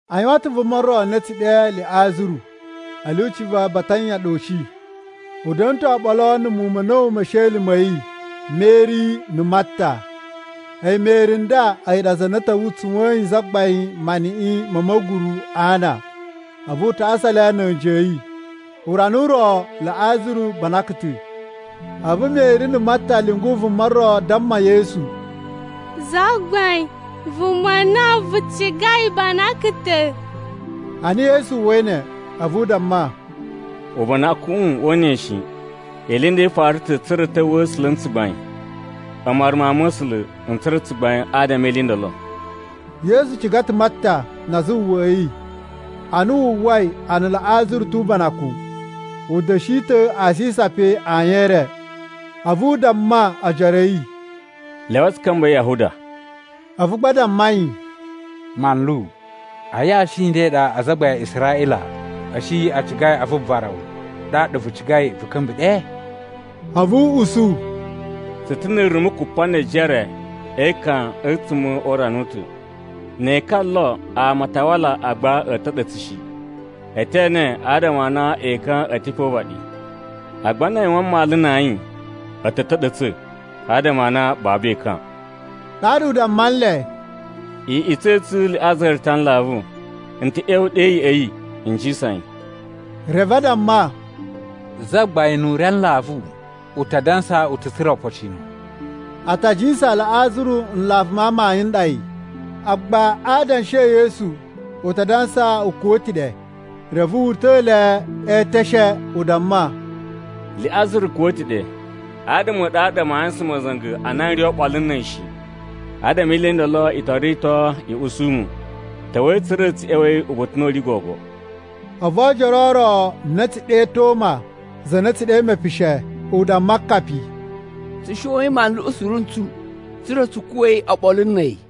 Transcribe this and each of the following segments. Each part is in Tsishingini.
A yuwan ta̱ vuma ro na a̱ tsu ɗe Liꞌazaru a̱ lyuci va Batanya ɗa u shi. U da̱na̱ ta̱ oɓolo na̱ muwun ma̱ a̱na̱wu me esheli ma̱ yi Meri na̱ Marta. A̱yi Meri nda a̱yi ɗa za na ta̱wa̱ tsuwa̱yin Zagbain maniꞌin ma̱ ma̱guru a ana, a̱vu u tasa le na̱ a̱nji a̱ yi. Urana u ro Liꞌazaru banakan ta̱. A̱vu Meri na̱ Marta a̱ lyungu vuma ro damma Yesu, “Zagbain, vuma na vu cigai banakan ta̱.” Ana Yesu uwwai ne, a̱vu u damma, “Ubanakuꞌun woo una yi shi. Ili i nda i fara ta̱ tsa̱ra̱ a̱ ta̱wa̱a̱ A̱sula̱ na̱ tsugbain. A̱mu waru Mawun ma̱ A̱sula̱, n tsura̱ tsugbain adama e ili i ndolo.” Yesu ciga ta̱ Marta na azawawaꞌa a̱ yi. Ana wu uwwai a na Liꞌazaru tu ubanakun, u da̱shi ta̱ asisa pe ayin e re. A̱vu u damma ojoro a̱ yi, “Lyawai tsu ka̱mba̱i Yahuda.” A̱vu gba a damma yi, “Manlu, a yashi i nda i ɗa azagbain a Israꞌila a̱ shi a cigai a vuvara wu, ɗaɗa vu cigai vu ka̱mba̱ ɗe?” A̱vu u usu, “Tsu ta̱ ni irumu kupa ne ejere e ekan a̱tsuma̱ o urana u ta̱. Ne ekan o lo, ama a ta wala agba a̱ ta̱ɗa̱tsa̱ shi. E te ene adama a na ekan a̱ ta̱ pe o uvaɗi. Agba na a yuwan mmalu na ayin, a̱ ta̱ ta̱ɗa̱tsa̱, adama a na babu ekan.” Ɗaɗa u damma nle, “Iꞌutsa̱ i tsu Liꞌazaru ta a nlavu, n ta̱ ꞌya̱wa̱ ɗe ya̱ꞌa̱ yi n jisan yi.” Reve a damma, “Zagbain nu u ri a nlavu, u ta dansa u ta̱ tsura̱ opocino!” A ta jiyasan Liꞌazaru nlavu ma amayun n ɗa yi, agba a adanshi e Yesu u ta dansa u kuwa̱ ta̱ ɗe. Reve wu uta̱ le eteshe u damma, “Liꞌazaru kuwa̱ ta̱ ɗe. Adama a̱ ɗu a ɗa maa yuwusan ma̱za̱nga̱ a na n ri oɓolo na̱ a̱yi shi. Adama e ili i ndolo i to rito i usu mu. Ta̱wa̱i tsa̱ra̱ tsu ꞌya̱wa̱i uba̱ta̱ u na u ri gogo.” A̱vu oojoro o ro a na a̱ tsu ɗe Toma (za na a̱ tsu ɗe “Mepishe”) u damma akapi, “Tsu shoyin manluꞌu suru ntsu, tsa̱ra̱ tsu kuwa̱i oɓolo na̱ a̱yi!”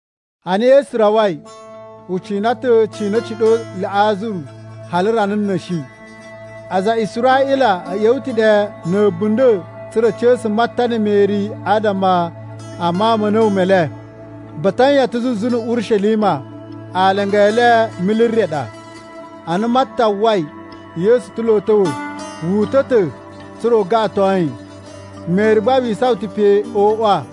Ana Yesu rawai, u cina ta̱ cina a̱ ciɗo ɗe Liꞌazaru hali rana na̱shi. Aza a Israꞌila a̱ ꞌya̱wa̱ ta̱ ɗe na̱ a̱bunda̱ tsa̱ra̱ a̱ ca̱sa̱ Marta na̱ Meri adama a mawun ma̱ a̱na̱wu me le. Batanya ta̱ zuzu na̱ Urishelima, alanga e le mili re ɗa. Ana Marta uwwai Yesu ta̱ lo a̱ ta̱wa̱, wu uta̱ ta̱ tsa̱ra̱ u gaꞌaton yi, Meri gba wi isawan ta̱ pe o uwa.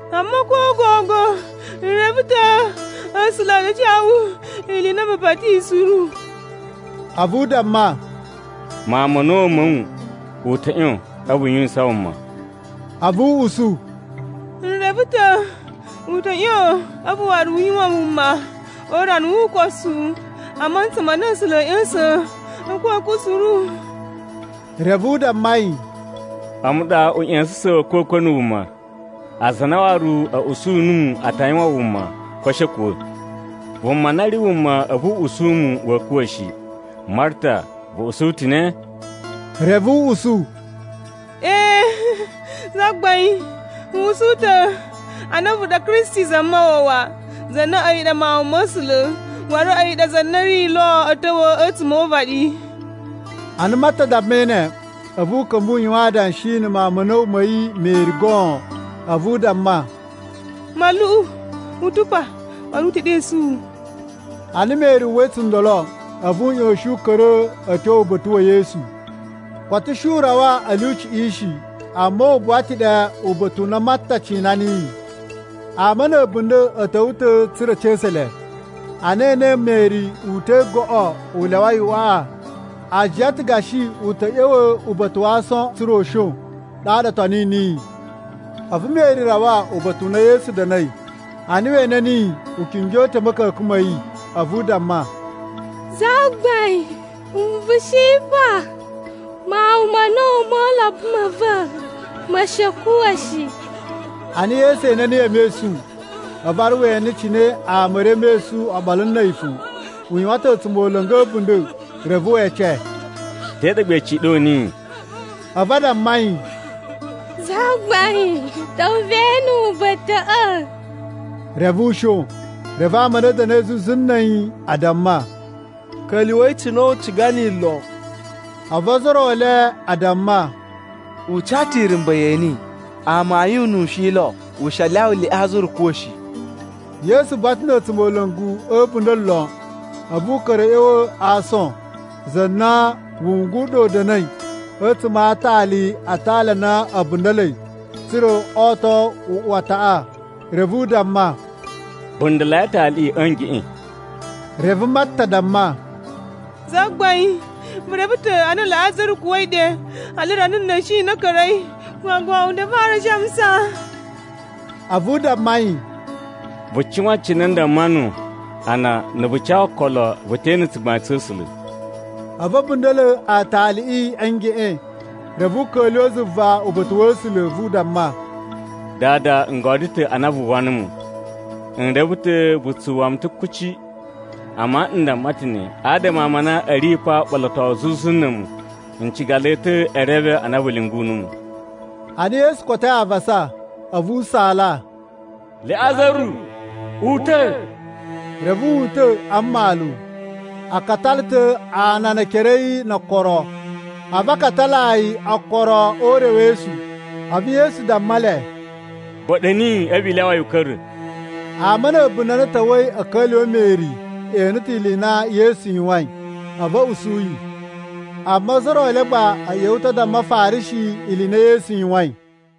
Amma ko gogo n reve ta̱ A̱sula̱ a ta ca wu ili i na vu pati niyi suru.” A̱vu u damma, “Mawun ma̱ a̱na̱wu ma̱ wu u ta̱ ꞌyon a̱vu u yuwisan wuma.” A̱vu u usu, “N reve ta̱ u ta̱ ꞌyon a̱vu waru u yuwan wuma o urana wu ukosu, a mantsa ma na A̱sula̱ a̱a̱ ꞌya̱sa̱n a̱kwa̱kwa̱ suru.” Reve u damma yi, “A̱mu ɗa uꞌya̱sa̱sa̱n wa̱ a̱kwa̱kwa̱ na̱ wuma. Aza a na waru a̱ usu numu a ta yuwan wuma ko a̱ shi a̱ kuwa̱. Vuma na ri wuma a̱vu u usu mu wa̱a̱ kuwa̱ shi. Marta vu usu ta̱ ne?” Reve u usu, “Ee, Zagbain. N usu ta̱ a na a̱vu ɗa Kristi Zamawawa, za na a̱yi ɗa Mawun ma̱ A̱sula̱, waru a̱yi ɗa za na ri lo a̱a̱ ta̱wa̱ a̱tsuma̱ o uvaɗi.” Ana Marta dammai ne, a̱vu u ka̱mba̱ u yuwan adanshi na̱ mawun ma̱ a̱na̱wu ma̱ yi Meri goon. A̱vu u damma, “Manluꞌu u ta̱ pa, waru u te ɗesu wu.” Ana Meri uwwai tsundolo, a̱vu u ꞌyoshin u ka̱ra̱ a̱ tyo uba̱ta̱ wa̱ Yesu. Koto u shi u rawa a̱ lyuciꞌi shi, amma u buwa ta̱ ɗe uba̱ta̱ u na Marta cina niyi. Ama na̱ a̱bunda̱ a̱ ta̱wa̱ ta̱ tsa̱ra̱ a̱ ca̱sa̱ le, ana e enei Meri uta̱i goꞌo u lyawai uꞌwaꞌa, a jiyan ta̱ gashi u ta̱ ꞌya̱wa̱ uba̱ta̱ wa aason tsa̱ra̱ u shon. Ɗaɗa o toni niyi. A̱vu Meri rawa uba̱ta̱ u na Yesu da̱na̱i. Ana we ene niyi, u kingyo ta̱ a̱ ma̱ka̱ka̱n ma̱ yi, a̱vu u damma, “Zagbain, na̱ vu shi pa, mawun ma̱ a̱na̱wu mo ulobo ma̱ va̱ ma̱ shi a̱ kuwa̱ shi.” Ana Yesu ene niyi e mesun, a̱vu waru we ene cine ama a̱ ri e mesun oɓolo na̱ a̱yi fo. U yuwan ta̱ a̱tsumola̱ngu a̱bunda̱. Reve we ece, “Te ɗa gba i ciɗo niyi?” A̱vu a damma yi, “Zagbain, ta̱wa̱ ve ene uba̱ta̱ꞌa̱.” Reve u shon. Reve ama a na a̱ da̱na̱i zuzu na̱ a̱yi a damma, “Ka̱lyuwa̱i cine u ciga niyi lon.” A̱vu ozo o ro e le a damma, “U ca ta̱ irumba̱ yeni. Amayun nu u shi lo u shi a lyawa Liꞌazaru kuwa̱ shi.” Yesu buwa ta̱ na̱ a̱tsumola̱ngu a̱ a̱bunda̱ lon. A̱vu u ka̱ra̱ a̱ ꞌya̱wa̱ a aason, za na wungu u ɗa u da̱na̱i a̱tsuma̱ a aatali na aatali a na a̱ bunda̱la̱i tsa̱ra̱ o to uꞌuwataꞌa. Reve u damma, “Bunda̱la̱i aataliꞌi a̱ ngeꞌen.” Reve Marta damma, “Zagbain, vu reve ta̱ a na Liꞌazaru kuwa̱i ɗe hali rana na̱shi na ka̱ra̱i, gogo u ta̱ fara a shamusa.” A̱vu u damma yi, “Vu cuwan cine n damma nuwu a na na̱ vu ca okolo, vu te ene tsugbain tsa̱ A̱sula̱.” A̱vu a̱ bunda̱la̱ aataliꞌi a̱ ngeꞌen. Reve u ka̱lyuwa̱ zuva uba̱ta̱ wa̱ A̱sula̱ a̱vu u damma, “Dada, n godyo ta̱ a na vu uwwa numu. N reve ta̱ vu tsu uwwa mu ta̱ kuci, amma n damma ta̱ ne adama a ama a na a̱ ri pa uɓolotowu zuzu na̱ a̱mu. N ciga le ta̱ e reve a na vu lyungu numu.” Ana Yesu kotoi avasa, a̱vu u saala, “Liꞌazaru, uta̱!” Reve wu uta̱ a mmalu. A katala ta̱ ana ne ekere a̱ yi no okoro, a̱vu a katalaa yi okoro o urewesu. A̱vu Yesu damma le, “Ba̱ɗa̱ niyi a̱vu i lyawa yi u ka̱ra̱.” Ama a̱ a̱bunda̱ a na a̱ ta̱wa̱i a̱ ka̱lyuwa̱ Meri e ene ta̱ ili i na Yesu yuwain, a̱vu a̱ usu yi. Amma ozo o ro e le gba a̱ ꞌya̱wa̱ ta̱ a damma Afarishi ili i na Yesu yuwain.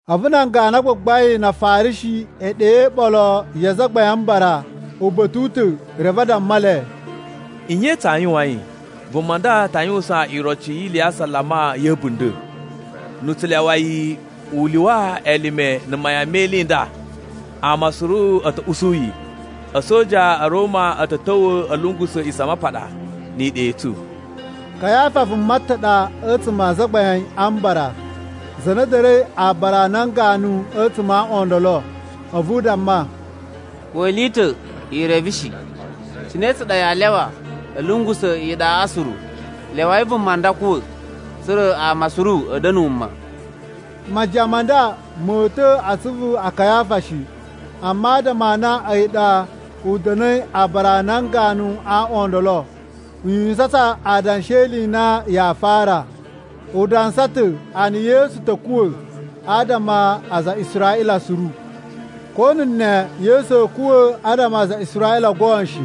A̱vu nan ganu a gbagbain na Afarishi e ɗe iɓolo ya Azagbain a Mbara uba̱ta̱ u ta̱ reve a damma le, “Nye tsaa yuwain? Vuma nda ta yuwusan iroci yi ili ya asalama ya̱ a̱bunda̱. Na̱ tsu lyawa yi u lyuwa elime na̱ mayan me ili i nda, ama suru a̱ ta̱ usu yi. A̱soja a̱ Roma a̱ ta̱ ta̱wa̱ a̱ lungusa̱ A̱a̱ꞌisamapaɗa ni iɗa i tsu.” Kayafa vuma ta̱ ɗa a̱tsuma̱ a Azagbain a Mbara za na da̱na̱i aabara a nan ganu a̱tsuma̱ a aaꞌwan o ndolo, a̱vu u damma, “Ko ili i ta̱ i reve shi! Cine tsa ɗa yaa lyawa a̱ lungusa̱ iɗaꞌa suru? Lyawai vuma nda kuwa̱, tsa̱ra̱ ama suru a̱ da̱na̱ wuma.” Majiyan ma nda mo uta̱ a asuvu a Kayafa shi. Amma adama a na a̱yi ɗa u da̱na̱i aabara a nan ganu a aaꞌwan o ndolo, u yuwisan ta̱ adanshi e ili i na yaa fara: U dansa ta̱ a na Yesu ta̱ kuwa̱ adama a aza a Israꞌila suru. Ko na̱ ne Yesu a̱a̱ kuwa̱ adama a aza a Israꞌila goon shi.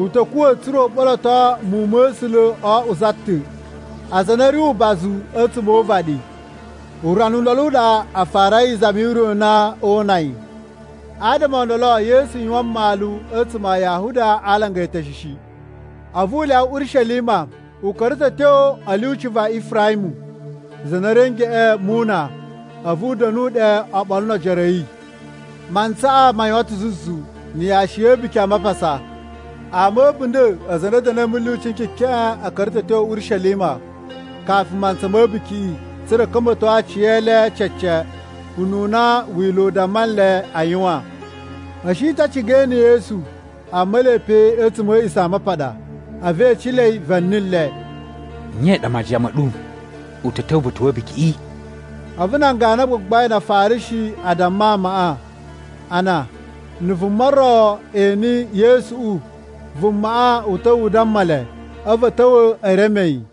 U ta̱ kuwa̱ tsa̱ra̱ u ɓoloto muwun ma̱ A̱sula̱ o oꞌwo za ta̱, aza a na a̱ ri ubazu a̱tsuma̱ o uvaɗi. Urana u ndolo u ɗa a farai izami yu ure u na oo una yi. Adama o ndolo, Yesu yuwan mmalu a̱tsuma̱ a Yahuda a alanga eteshe shi, a̱vu u lyawa Urishelima. U ka̱ra̱ ta̱ a̱ tyo a̱ lyuci va Ifaramu, za na ri a̱ ngeꞌen mu una, a̱vu u da̱nu ɗe oɓolo no ojoro a̱ yi. Mantsaꞌa ma yuwan ta̱ zuzu na̱ yashi ya̱ A̱buki a Mapasa. Ama a̱ a̱bunda̱ aza a na a̱ da̱na̱i a̱ mulyuci n kekeꞌen a̱ ka̱ra̱ ta̱ a̱ tyo Urishelima kafu mantsa ma̱ a̱bukiꞌi, tsa̱ra̱ a̱ ka̱mba̱to aciyele cece ununa Wila̱ u damma nle a yuwan. A̱ shi ta̱ a ciga e ene Yesu, amma ele pe a̱tsuma̱ a̱ A̱a̱ꞌisamapaɗa, a̱vu e ecelei va̱ni le, “Nye i ɗa majiyan ma̱ ɗu? U ta̱ ta̱wa̱ uba̱ta̱ wa̱ a̱bukiꞌi?” A̱vu nan ganu a gbagbain na Afarishi a damma amaꞌa a na na̱ vuma ro ene Yesuꞌu, vumaꞌa u ta̱wa̱ u damma le. A̱vu a̱ ta̱wa̱ e reme yi.